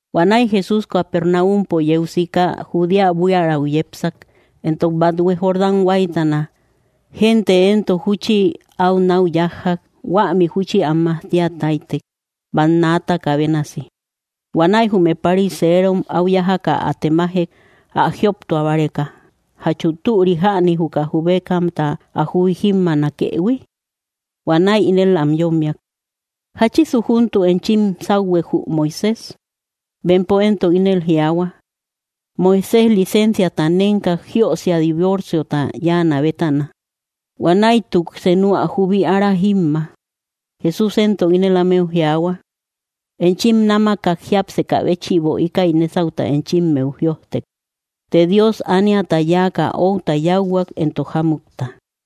Huanäi Jesús Capernaumpo yeu sika, Judea buiärau yepsak, entok bathue Jordán huáytana. Gente éntok júchi au nau yájjak, huämi júchi am majtia táytek, bannaataka bénasi. Huanäi jume pariserom áu yájaka ä temajek, ä jioptua báreka, jachu türi jäni, juka jubekamta ä jubi jímmaanakëhui. Huanäi ínel am yommiak: —¿Jáchisu júntuk enchim sáuhuek jü Moisés? Bempo éntok ínel jiaahua: —Moisés licensiata nénkak, jiösia divorciota yáanä bétana. Huanäituk senu ä jubi ára jímma. Jesús éntok ínel ámeu jiaahua: —Enchim námakak jiápsekä béchïbo íkäi nésauta enchimmeu jïojtek. Të Dios ániata yáaka outa yáuhuak, entok jámutta.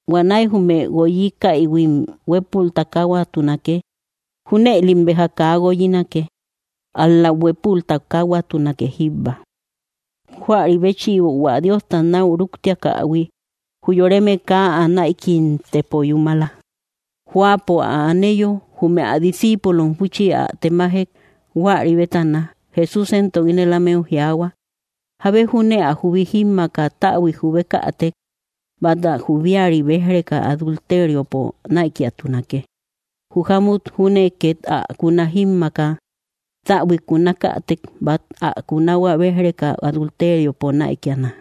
Huanäi jume guoyiakaïhuim huépul takahuatunake.” Júnëlim béja kaa guoyinake, ál‑lam huépul takahuatunake jíbba. Huäri béchïbo hua Diosta nau rúktiakähui, jü yoreme kaa ä näikimtepo yúmala. Jóapo ä aneyo, jume ä discíipulom júchi ä temajek huäri bétana. Jesús éntok ínel ámeu jiaahua: —Jábe júne ä jubi jímmaaka täbuik jubekätek, bát ä jubiari béj‑reka adulteriopo näikiatunake. Jü jámut júne ket ä kuna jímmaaka täbuik kunakätek, bát ä kunahua béj‑reka adulteriopo näikiana.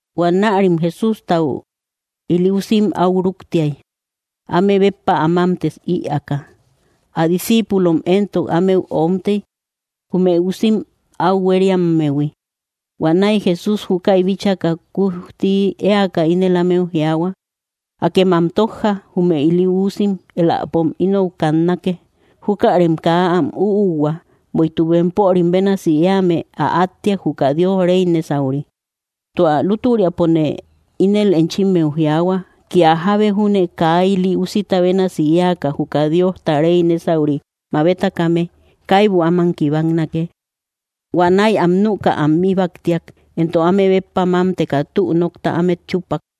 Huanärim Jesústau ili usim au rúktiay, áme béppa ä mamtë ïaaka. Ä discíipulom éntok ámeu omtey, jume usim áu huériammehui. Huanäi Jesús júkäi bíchaka, kujti éaka ínel ámeu jiaahua: —Akem am tójja, jume ili uusim, éläpom inou kannake. Júkärem kaa am üuhua, bueïtuk bempörim bénasi éame ä átteak, juka Diosta rey nésauri. Tua lútüriapone ínel enchimmeu jiaahua, kia jábe júne kaa ili úsita bénasi éaka juka Diosta rey nésauri mabetakame, kaibu áman kibaknake. Huanäi am nüka am íbaktiak, entok áme béppa mámteka tü nokta ámet chúppak.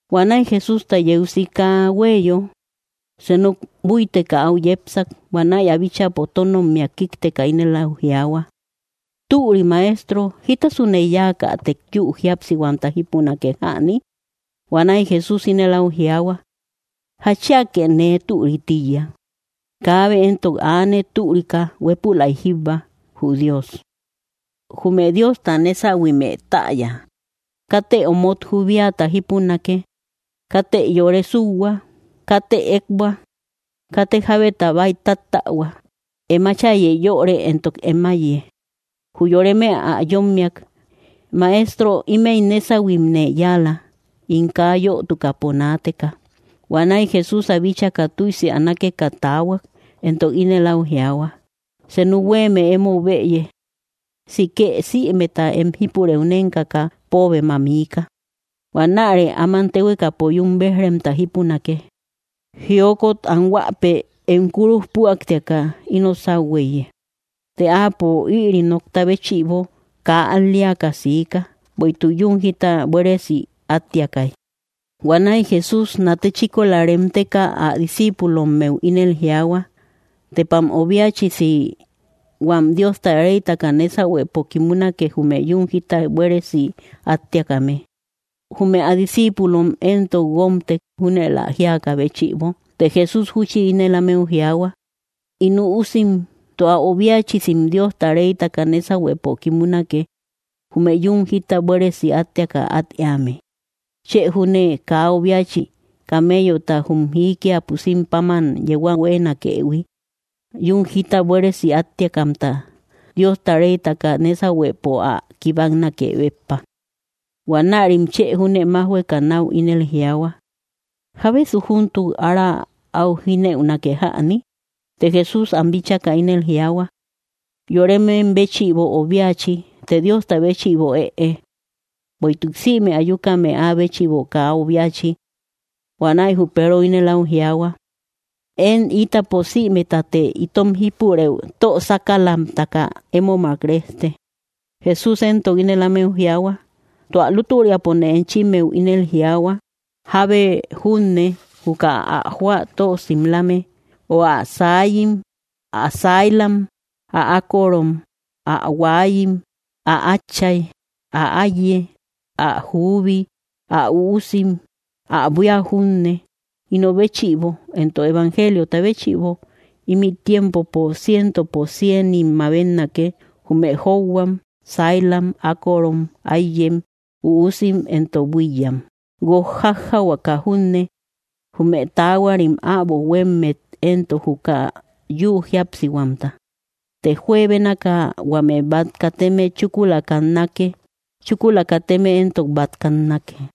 Huanäi Jesústa yeu sika hueyo. Senu búiteka au yépsak, huanäi ä bíchäpo tónommia kíkteka, ínel au jiaahua: —Türi Maestro, ¿jítasune yáakätek, yü jíapsihuamta jipunake jäni? Huanäi Jesús ínel au jiaahua: —¿Jatchiake nee türï tíiya? Kaabe éntok aane türika, huépülaika jíbba, jü Dios. Jume Diosta nésahuimë täya: “Katë omot jubiata jípunake. Katë yore súuhua. Katë ekbua. Katë jábetat kia nooka. Katë jábeta bäitáttähua. Em áchayë yöre, entok em áiye.” Jü yoreme ä yommiak: —Maestro, ímëi nésahuimne yáala, ín kaa yötukäpo naateka. Huanäi Jesús ä bíchaka tüisi ä nákeka taahuak, éntok ínel au jiaahua: —Senu huéeme emou bëye: sikë sïmeta em jípurëu nénkaka póobem ä miika. Huanärë áman téhuekapo yún béj‑remta jípunake. Jiokot anhuäpe em kúruj püaktiaka ino sáu huéiye. Të áapo ïri nokta béchïbo kaa al‑leaka siika, bueïtuk yún jita buéresi áttiakay. Huanäi Jesús nate chíkola reemteka, ä discíipulommeu ínel jiaahua: —¡Tepam obiachisi huam Diosta reytaka nésahuepo kimunake, jume yún jita buéresi áttiakame! Jume ä discíipulom éntok guómtek, júnël ä jíakä béchïbo. Të Jesús júchi ínel ámeu jiaahua: —In üusim, ¡tua obiachisim Diosta reytaka nésahuepo kimunake, jume yún jita buéresi áttiaka at éame! Chë júne kaa obiachi camellota jum jiikia pusim páman yeu ä huéenakëhui, yún jita buéresi áttiakamta Diosta reytaka nésahuepo ä kibaknake béppa. Huanärim chë júne májhueka nau ínel jiaahua: —¿Jábesu júntuk ára au jínëunake jäni? Të Jesús am bíchaka ínel jiaahua: —Yoremem béchïbo obiachi, të Diosta béchïbo ëe; bueïtuk sïme ayukame áa béchïbo kaa obiachi. Huanäi jü Peero ínel au jiaahua: —Én ítapo sïmetate itom jípurëu tö sákalamtaka émomak rejte. Jesús éntok ínel ámeu jiaahua: —Tua lútüriapone enchimmeu ínel jiaahua, jábe junne juka ä jóa tö simlame, o ä saayim, ä sailam, ä ákorom, ä huaayim, ä átchay, ä áiye, ä juubi, ä üusim, ä buía junne, ino béchïbo entok evangeliota béchïbo, ímï tiempopo cientopo cienim mabetnake, jume jóuhuam, sailam, ákorom, áiyem, üusim, entok buíyyam, guok jájjahuaka junne; jume taahuarim äbo huéemet éntok, juka yü jíapsihuamta. Të juebénaka huame bát kateme chúkula kannake; chúkula kateme éntok bát kannake.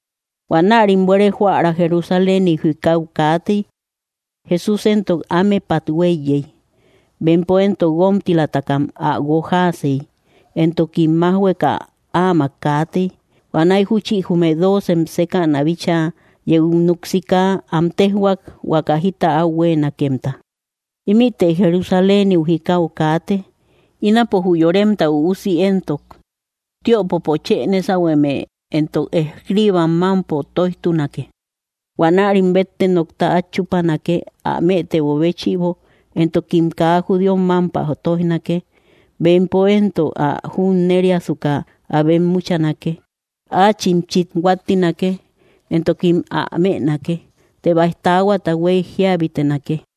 Huanärim buere joära Jerusaléniu, jikau kaatey; Jesús éntok ámepat huéiyey. Bempo éntok guomtilatakam ä guojaasey, entokim májhueka áamak kaatey. Huanäi júchi jume dóocem sékäna bíchaa yeu núk sika, am téjhuak huaka jita au huéenakemta. Huanäi ínel ámeu jiaahuak: —Ímïte Jerusaléniu jikau kaate. Ínapo jü Yoremta Üusi éntok tiöpopo chë nésahueme entok escribam mámpo tóijtunake. Huanärim bette nokta át chúpanake, ä mëtebo béchïbo, entokim kaa judíom mámpä tóijnake. Bempo éntok ä junneriasuka ä bemmuchanake. Áachim chit huáttinake, entokim ä mënake; të baij taahuata huey jíabitenake.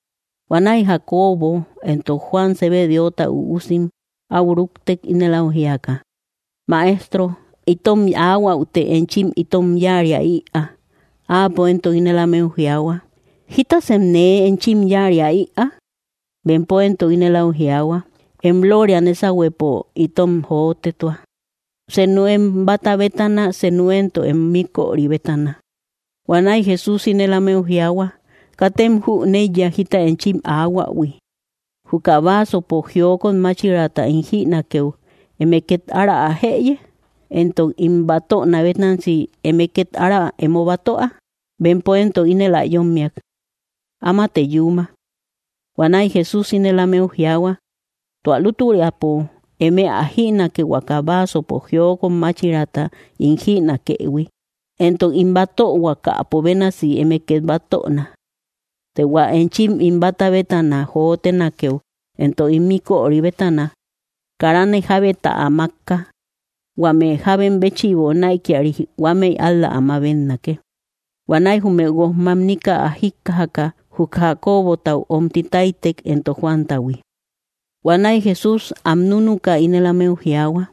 Huanäi Jacobo entok Juan, Zebedeota üusim, au rúktek ínel au jíaka: —Maestro, itom aahuäute enchi itom yáaria ïaa. Áapo éntok ínel ámeu jiaahua: —¿Jítasem nee enchim yáaria ïaa? Bempo éntok ínel áu jiaahua: —Em lóoria nésahuepo itom jotetua, seenu em báta bétana, senu éntok em míköri bétana. Huanäi Jesús ínel ámeu jiaahua: —Katem jüneiya jita enchim aahuähui. Juka vaasopo jiokot máchiraata ín jïnakeu, ¿eme ket ára ä jëye? Entok ín batöna bénasi, ¿eme ket ára emo batöa? Bempo éntok ínel ä yommiak: —Amate yúma. Huanäi Jesús ínel ámeu jiaahua: —Tua lútüriapo, eme ä jïnake, huaka vaasopo jiokot máchiraata ín jïnakëhui, entok ín batöhuakäpo bénasi eme ket batöna; të hua enchim ín báta bétana jotenakeu entok ín míköri bétana, kárane jábeta ä mákka, huame jábem béchïbo näikiari huámëi ál‑la ä mabetnake. Huanäi jume guojmamnika ä jíkkajaka, jü Jacobotau omti táytek, entok Juantahui. Huanäi Jesús am núnuka, ínel ámeu jiaahua: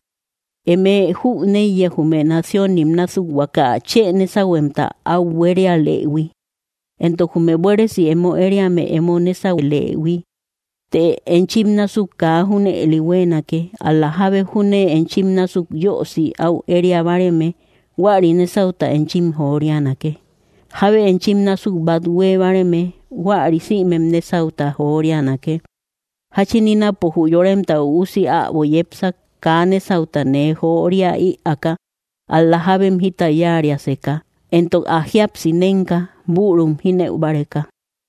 —Eme jüneiya jume naciónim násuk huaka chë nésahuemta au buérialëhui, entok jume buéresi emo ériame emo nésaulëhui. Të enchim násuk kaa junëli huéenake, ál‑la jábe júne enchim násuk yösi au éria báareme, huäri nésauta enchim jorianake. Jábe enchim násuk bát huée báareme, huäri sïmem nésauta jorianake. Jáchin ínapo jü Yoremta Üusi äbo yepsak, kaa nésauta nee joria ïaaka, ál‑la jábem jita yáariaseka, entok ä jíapsi nénka, bürum jínëu báreka.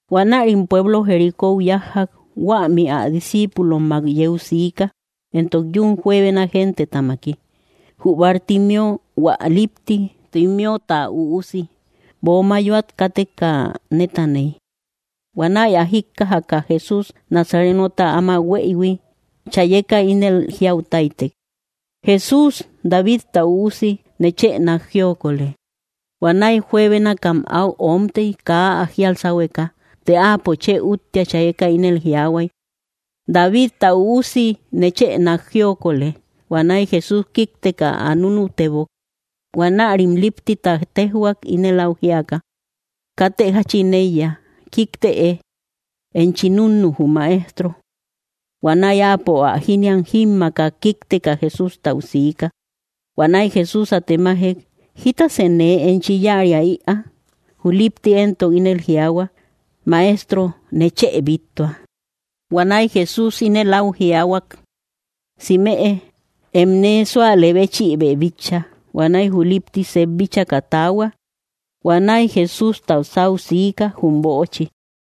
Huanärim pueblo Jericóu yájjak. Huämi ä discíipulommak yeu siika, entok yun juebena gentetamaki. Jü Bartimeo, hua lipti, Timeota üusi, böo mayoat káteka nétaney. Huanäi ä jíkkajaka Jesús Nazarenota áma hueïhui, chayeka ínel jiau táytek: —¡Jesús, Davidta Üusi, nechë nák jiokolë! Huanäi juebénakam au omtey, kaa ä jíal sáhueka. Të áapo chë úttia chayeka ínel jiaahuay: —¡Davita Üusi, nechë nák jiokolë! Huanäi Jesús kíkteka, ä núnutebok. Huanärim líptita tejhuak, ínel áu jíaka: —Katë jáchin éiya. Kíktëe; enchi núnnu jü Maestro. Huanäi áapo ä jíniam jímmaaka, kíkteka Jesústau siika. Huanäi Jesús ä temajek: —¿Jítasë nee enchi yáaria ïaa? Jü lípti éntok ínel jiaahua: —Maestro, nechë bíttua. Huanäi Jesús inel au jiaahuak: —Simeë; em nee súalë béchïbë bitcha. Huanäi jü lipti sep bíchaka taahua, huanäi Jesústa sáu siika jum böochi.